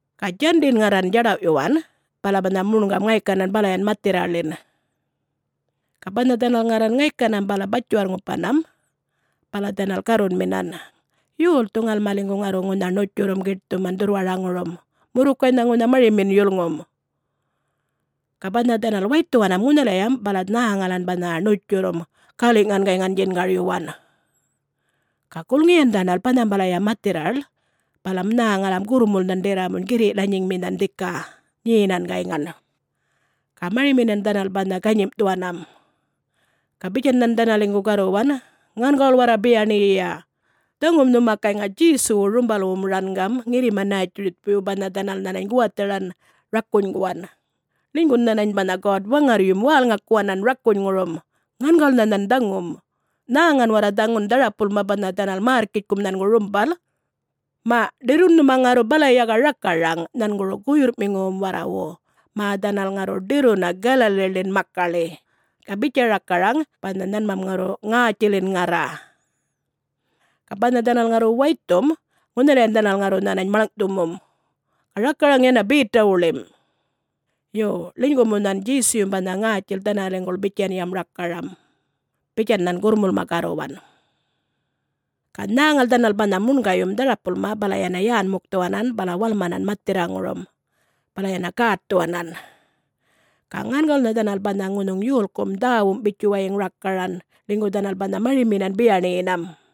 Ga Djandin ŋarran djadawꞌyuwan, bala banha muṉgam ŋaykanan balayan mathirraḻin. Ga banha dhanal ŋarran ŋaykanam bala batjiwarr-ŋupanam, bala dhanal garrunminan, “Yolthu ŋalmaliŋgu ŋarru ŋunha ṉutjurrum giṯthuman dhurrwaraŋurum? Murrukaynha ŋunha marimin yulŋum.” Ga banha dhanal waythuwanam ŋunhalayam bala nhäŋalan banha ṉutjurrum, galiꞌŋan gayŋan djingaryuwan. Ga gulŋiyan dhanal banhambalaya mathirraḻ bala nhäŋalam gurrmulnhan ḏirramuny girriꞌ lanyiŋminhan dhika, nyenan gayŋan. Ga mariminan dhanal banha ganyimꞌthuwanam. Ga bitjan nhan dhanaliŋgu garruwan, “Ŋangawul warra biyaṉiyiya. Dhaŋum nhuma gayŋa Djesuwu rumbalwum rangam ŋirrima-Nätjiritjpuywu banha dhanal nhanany guwatharan rakunyguwan. Ḻinygun nhanany banha God-Waŋarryum wälŋakuwanan rakunyŋurum, ŋangawulnha nhan dhaŋum. Nhäŋan warra, dhaŋun dharapulma banha dhanal märrkitjkum nhangu rumbal. Maꞌ ḏirrun nhuma ŋarru balaya ga rakaraŋ nhanguru guyurrꞌmiŋuwum warrawu mä dhanal ŋarru ḏirruna Galaliḻin makaḻi. Ga bitja rakaraŋ banha nhanmam ŋarru ŋätjilin ŋarra, ga banha dhanal ŋarru waythum, ŋunhalayan dhanal ŋarru nhanany maḻŋꞌthumum. Ga rakaraŋ yana Betawuḻim. Yo, ḻinygu mu nhan Djesuyum banha ŋätjil dhanaliŋguḻ bitjanyam rakaran,” bitjan nhan gurrmulma garruwan. Ga nhäŋal dhanal banha muṉgayum dharapulma bala yana yän-mukthuwanan bala walmanan mathirraŋurum, bala yana gätthuwanan. Ga ŋangawulnha dhanal banha ŋunhuŋ yolkum dhäwum bitjuwayiŋ rakaran ḻinygu dhanal banha mariminan biyaṉiyinam.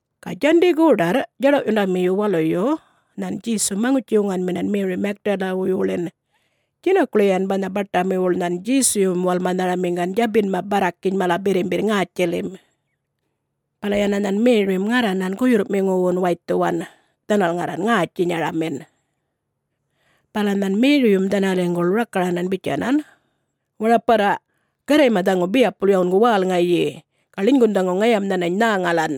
Ga Djandi goḏarr, djaḏawꞌyundamiyu waluyu nhan Djesum maŋutji-wuŋanminan Meri Magdalawuywuḻin. Djinakuḻiyan banha baṯamiwuḻ nhan Djesuyum walmanharamiŋgan djabinma barrakiny mala birrimbirr ŋätjilim. Bala yana nhan Merim ŋarranan guyurrꞌmiŋuwun waythuwan, dhanal ŋarran ŋätjinyaramin. Bala nhan Meriyum dhanaliŋguḻ rakaranan bitjanan, “Waraparra, Garrayma dhaŋu biyapul yawungu wälŋayi, ga ḻinygun dhaŋu ŋayam nhanany nhäŋalan.”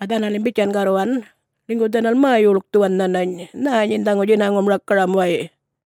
Ga dhanalim bitjan garruwan ḻinygu dhanal mä-yulkthuwan nhanany, “Nhä nyin dhaŋu djinaŋum rakaram way!”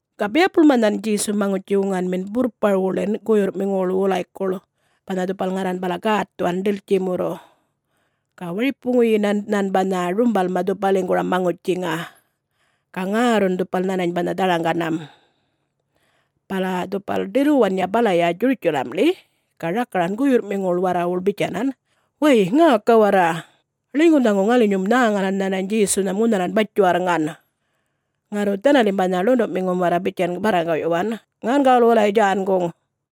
Ga biyapulma nhan Djesu maŋutji-wuŋanmin burrparwuḻin guyurrꞌmiŋuwuḻ wulaykuḻ, banha dhupal ŋarran bala gätthuwan ḏiltjimurru. Ga waripuŋiyinan nhan banha rumbalma dhupaliŋguram maŋutjiŋa. Ga ŋärrun, dhupal nhanany banha dharaŋganam. Bala dhupal ḏirruwanya balaya Djurutjalamḻi ga rakaran guyurrꞌmiŋuwuḻ warrawuḻ bitjanan, “Way, ŋäka warra! Ḻinygun dhaŋu ŋalinyum nhäŋalan nhanany Djesunham ŋunhalan batjiwarrŋan!” Ŋarru dhanalim banha ḻunduꞌmiŋum warra bitjan barraŋgaꞌyuwan, “Ŋangawul wulay djänguŋ.”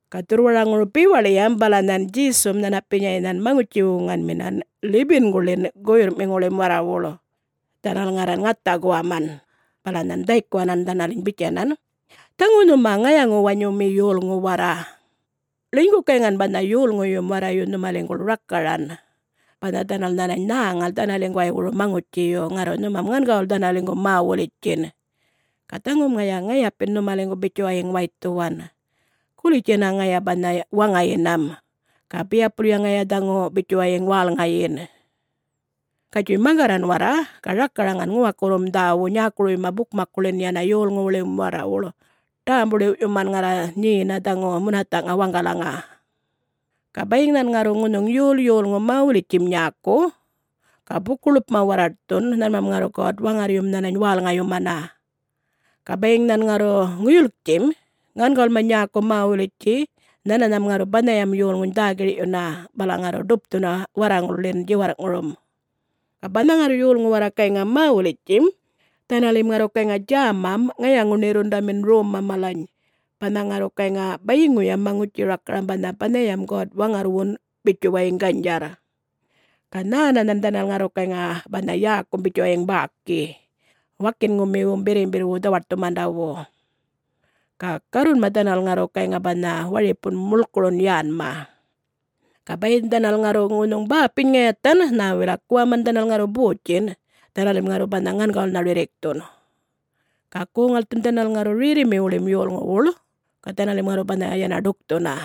Ga dhurrwaraŋuru bewaḻiyam bala nhan Djesum nhanapinyay nhan maŋutji-wuŋanminan 11-guḻin guyurrꞌmiŋuwuḻ warrawuḻ, dhanal ŋarran ŋatha guwaman. Bala nhan dhaykuwanan dhanaliny bitjanan, “Dhaŋu nhuma ŋayaŋu-wanyumi yolŋu warra. Ḻinygu gayŋan banha yolŋuyum warrayu nhumaliŋguḻ rakaran banha dhanal nhänany nhäŋal dhanaliŋguwaywuru maŋutjiyu, ŋarru nhumam ŋangawul dhanaliŋgu mä-wulitjtjin. Ga dhaŋum ŋaya ŋayapin nhumaliŋgu bitjuwayiŋ waythuwan. Gulitj yana ŋaya banha waŋayinam, ga biyapulya ŋaya dhaŋu bitjuwayiŋ wälŋayin. Gatjuy maŋgarran warra ga rakaraŋan ŋuwakurrum dhäwu nyäkuruyma bukmakkuḻin yana yolŋuwuḻim warrawuḻ, ḏämbu-ḻiwꞌyuman ŋarra nyena dhaŋu munathaꞌŋa waŋgalaŋa. Ga bayiŋ nhan ŋarru ŋunhuŋ yol yolŋu mä-wulitjtjim nyäku, ga buku-ḻupma warraṯthun, nhanmam ŋarru God-Waŋarryum dhanaliny wälŋayumana. Ga bayiŋ nhan ŋarru ŋuyulktjim, ŋangawulma nyäku mä-wulitjtji nhananham ŋarru banhayam yolŋuny dhä-girꞌyuna bala ŋarru ḏupthuna warraŋulḻin djiwarrꞌŋurum. Ga banha ŋarru yolŋu warra gayŋa mä-wulitjtjim, dhanalim ŋarru gayŋa djämam ŋayaŋu-ṉirrundamin romma malany banha ŋarru gayŋa bayiŋuyam maŋutji-rakaram banha banhayam God-Waŋarrwun bitjuwayiŋ ganydjarr. Ga nhänanhan dhanal ŋarru gayŋa banha yäkum bitjuwayiŋ bäki wakinŋumiwum birrimbirrwu dhawaṯthumandawu. Ga garrunma dhanal ŋarru gayŋa banha waripun mulkurun yänma. Ga bayiŋ dhanal ŋarru ŋunhuŋ bäpiny ŋayathan, nhä wilak guwaman dhanal ŋarru botjinꞌ, dhanalim ŋarru banha ŋangawulnha rirrikthun. Ga goŋ-ŋalthun dhanal ŋarru rerrimiwuḻim yolŋuwuḻ, ga dhanalim ŋarru banha yana ḏukthuna.”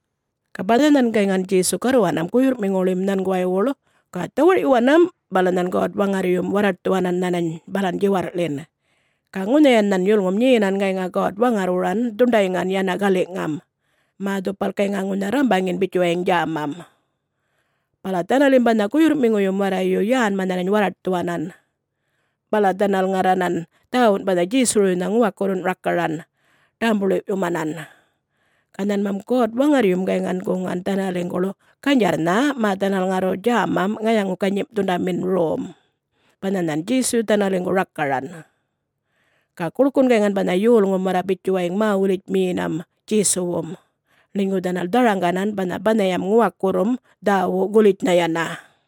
Ga banha nhan gayŋan Djesu garruwanam guyurrꞌmiŋuwuḻim nhanguwaywuḻ, ga dhawarꞌyuwanam, bala nhan God-Waŋarryum warraṯthuwanan nhanany balan djiwarrꞌḻin. Ga ŋunhayan nhan yulŋum nyenam gayŋa God-Waŋarrwuran dhuṉḏayŋan yana galiꞌŋam, mä dhupal gayŋa ŋunha rrambaŋin bitjuwayiŋ djämam. Bala dhanalim banha guyurrꞌmiŋuyum warrayu yänma nhanany warraṯthuwanan. Bala dhanal ŋarranan dhäwun banha Djesuwuruynha ŋuwakurrun rakaran ḏämbu-ḻiwꞌyumanan. Ga nhanmam God-Waŋarryum gayŋan guŋan dhanaliŋguḻ ganydjarrnha mä dhanal ŋarru gayŋa djämam ŋayaŋu-ganyimꞌthundamin rom, banhan nhan Djesuyu dhanaliŋgu rakaran. Ga guḻkun gayŋan banha yolŋum warra bitjuwayiŋ mä-wulitjmiyinam Djesuwum, ḻinygu dhanal dharaŋganan banha banhayam Ŋuwakurrum Dhäwu gulitjnha yana.